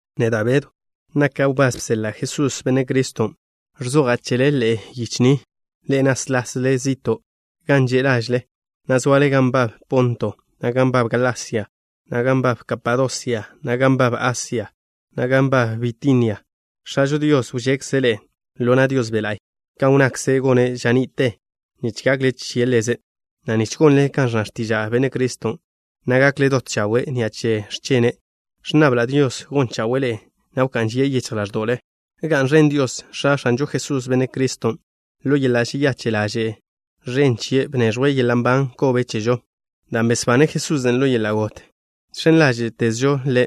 Neda' Bedw, naka' wbás bseḻa' Jesús, Benne' Criston'. Ẕzoja' chele ḻe'e yiche ni, ḻe'e náslasle zi'to' gan že' lažle, na' zoale gan nbab Ponto, na' gan nbab Galasia, na' gan nbab Kapadosia, na' gan nbab Asia, na' gan nbab Bitinia. X̱ažo Dios wžekze' ḻe'e ḻo na' Dios Be' La'y kan wnnakze' gone' ža ni'te nich gakle che Ḻeze', na' nich gonle kan ẕnna x̱tiža' Benne' Criston', na' gakle dot chawe' ni'a che x̱chene'. Ẕnnabla' Dios gon chawe'e ḻe'e, na' wká'n žie' yichj ḻáẕdo'le. ¡Ga'n ẕen Dios, X̱a X̱anžo Jesús, Benne' Criston'! Ḻo yeḻa' žeyache' ḻaže' ẕen chie' bneẕjwe' yeḻa' nban kobe chežo. Dan' besbane' Jesusen' ḻo yeḻa' got žx̱en ḻáže'tezžo Ḻe',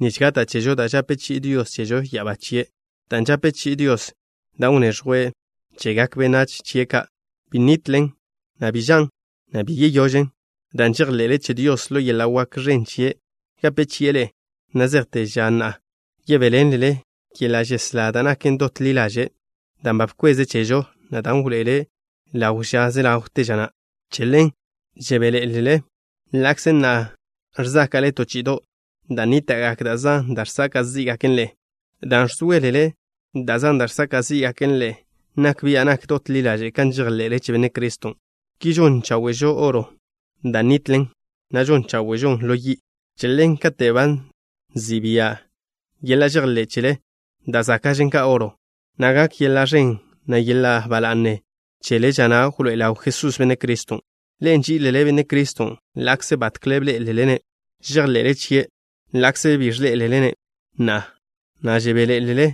nich gata' chežo da' žape chi'i Dios chežo ya'abá chie'. Dan' žape chi'i Dios, dan' wneẕjwe' chegak benách chie' ka', bi nitlen, na' bi žan', na' bi yeyožen. Dan' žejḻe'le che Dios, ḻo yeḻa' wak ẕen chie' gape chi'e ḻe'e na' zejte ža na' yebéḻenlele yeḻa' žeslá da' naken dot ḻi ḻaže', dan' ba bkweze' chežo, na' dan' wḻoe'ele' ḻaw ža ze ḻawte ža na'. Che ḻen žebéḻe'elele, ḻa'kze na'a ẕzáka'le to chi'ido' dan' nníta'gak da' zan da' žsaka' zí'gaken ḻe'e. Dan' ẕzóelele da' zan da' žsaka' zí'gaken ḻe'e, nak bia' nak dot ḻi ḻaže' kan žejḻe'le che Benne' Criston'. Ki žon cháwe'žo oro, da' nitlen, na' žon cháwe'žon ḻo yi'. Che ḻen, kate' ba nzi' bia' yeḻa' žejḻé' chele, da' záka'žen ka oro na', na' gak yeḻa' ẕen, na' yeḻa' ba la'ne chele ža na' wḻoé'e ḻaw Jesús, Benne' Criston'. Ḻe'e nží'ilele Benne' Criston' ḻa'kze batkle bḻé'elele-ne'. Žejḻe'le chie' Ḻe' ḻa'kze bi ẕḻé'elele-ne' na'a, na' žebéḻe'elele.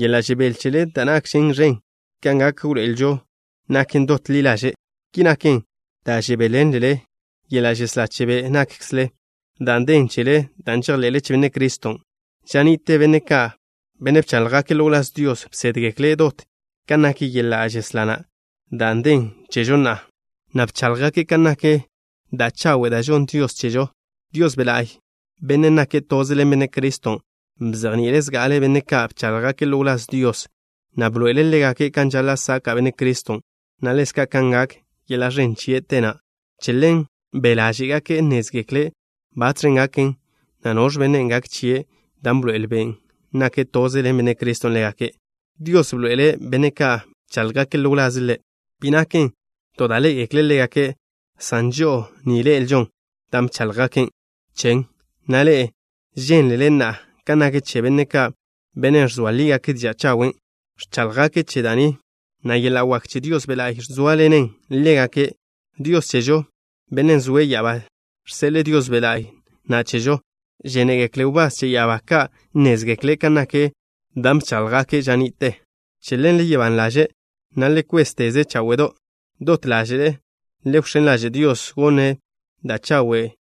Yeḻa' žebél chele da' nakžen ẕen ka gak wḻoe'elžo, naken dot ḻi ḻaže'. Ki naken dan' žebéḻenlele yeḻa' žeslá che be' nákkzele dan' den chele dan' žejḻe'le che Benne' Criston'. Ža ni'te benne' ka', benne' bcháḻjgake' ḻo wláz Dios, bsédgekle' dot kan nak yeḻa' žeslá na', dan' den chežo na'a, na' bcháḻjgake' kan nak da' chawe' da' žonn Dios chežo. Dios Be' La'y, Benne' nake' toze ḻen Benne' Criston', bzejni'ile' zga'ale benne' ka' bcháḻjgake' ḻo wláz Dios, na' bḻoe'ele' ḻégake' kan žaḻa' saka' Benne' Criston', na' ḻezka' kan gak yeḻa' ẕen chie' te na'. Che ḻen be' ḻáže'gake' nnézgekle' batx̱ gaken, na' noẕ benne' gak chie' dan' bḻoe'el Ben' nake' toze ḻen Benne' Criston' ḻégake'. Dios bḻoe'ele' benne' ka' bcháḻjgake' ḻo wlaze' Ḻe', bi naken to da' ḻé'egekle' ḻégake', san žo'o ni ḻe'elžo dan' bcháḻjgake' chen, na' ḻe'e žénlele na'a kan nak chen. Benne' ka', benne' ẕzoa lígake' diža' chawen', ẕcháḻjgake' che da' ni, na' yeḻa' wak che Dios Be' La'y zóaḻenen ḻégake'. Dios chežo, Bennen' zoe' ya'abá, žseḻe'e Dios Be' La'y na' chežo. Žénegekle wbás che ya'abá ka' nnézgekle' kan nak dan' bcháḻjgake' ža ni'te. Che ḻen, le gak ban ḻaže' na' le kwézteze cháwe'do'. Dot ḻáže'le le wx̱én ḻaže' Dios gonne' da' chawe'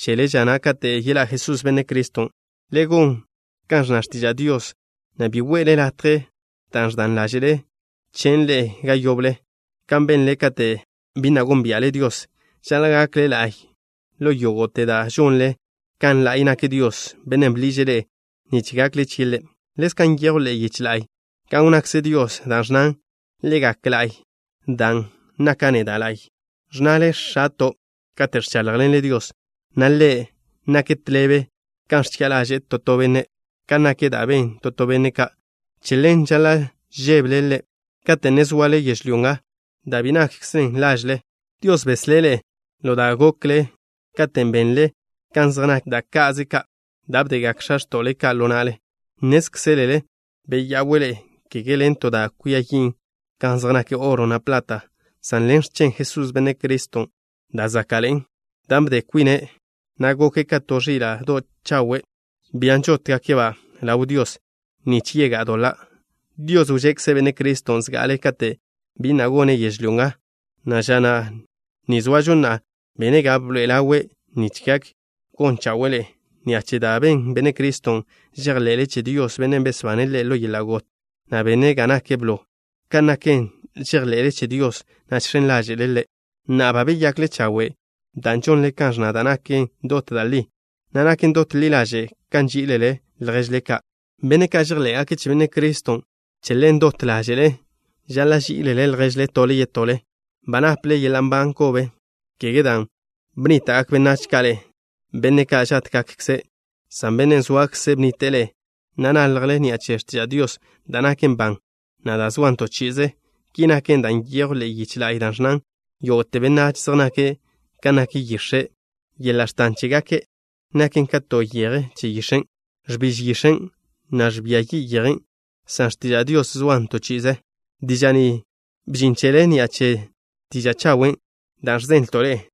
chele ža na' kate' yeḻá' Jesús, Benne' Criston'. Le gon kan ẕnna x̱tiža' Dios, na' bi we'le latje da' ẕdan ḻáže'le chen' ḻe'e ga yoble, kan benle kate' bi na' gónbia'le Dios. Žaḻa' gakle la'y ḻo yógo'te da' žonle, kan la'y nak Dios, Bennen' bḻiže' ḻe'e nich gakle chie' Ḻe'. Ḻezka' nyejw ḻe'e yiche la'y, kan wnnakze Dios, da' ẕnnan: “Le gak la'y, dan' naka' neda' la'y.” Ẕnnale: “X̱ato'” kate' ẕcháḻjḻenle Dios, na' Ḻe', nak tḻebe kan ẕchi'a ḻaže'e to to benne' kan nak da' ben to to benne' ka'. Che ḻen žaḻa' žébele Ḻe' kate' ne zoale yežlyó nga, da' bi nakkzen lažle. Dios beslé' ḻe'e ḻo da' gokle ža na' katen' benle kan zej nak da' ka'ze ka' da' bdegak x̱a x̱to'le ka' ḻo na'le. Nnézkzelele beya'we' ḻe'e, kege ḻen to da' kwia yin' kan zej nak oro, na' plat, san ḻen x̱chen Jesús, Benne' Criston', da' záka'ḻe'en, dan' bde kwine', na' goke' ka to ẕila' dot chawe', bian' žótgake'-ba' ḻaw Dios nich yegá'a doḻa'. Dios wžekze' Benne' Criston' zga'ale kate' bi na' gone' yežlyó nga, na' ža ni zoažo na'a bene' ga bḻoe'e ḻawe' nich gak gon chawe'e ḻe'e. Ni'a che da' ben Benne' Criston' žejḻe'le che Dios, Bennen' besbane' Ḻe' ḻo yeḻa' got, na' bene' ga nake' blo. Ka' naken, žejḻe'le che Dios, na' žx̱en ḻáže'le Ḻe'. Na'a, ba beyakle chawe' dan' žonle kan ẕnna da' naken dot da' li, na' naken dot ḻi ḻaže' kan nží'ilele lježle ka', benne' ka' žejḻé'gake' che Benne' Criston'. Che ḻen, dot ḻáže'le žaḻa' ží'ilele lježle tole yetole. Ba naple yeḻa' nban kobe, kege dan' bnníta'gak benách ka' ḻe'e, benne' ka' žátgakkze', san Bennen' zoakze' bnnite'e ḻe'e, na' naljle ni'a che x̱tiža' Dios, da' naken ban, na' da' zoan to chi'ize. Ki naken, dan' nyejw ḻe'e yiche la'y da' ẕnnan: Yógo'te benách zej nake' kan nak yix̱e'. Yeḻa' x̱tan chégake' naken ka to yeje che yix̱en'. Ẕbiž yix̱en', na' ẕbia yi' yejen'. San x̱tiža' Dios zoan to chi'ize. Diža' ni bžin chele ni'a che diža' chawen' da' ẕzenlto' ḻe'e.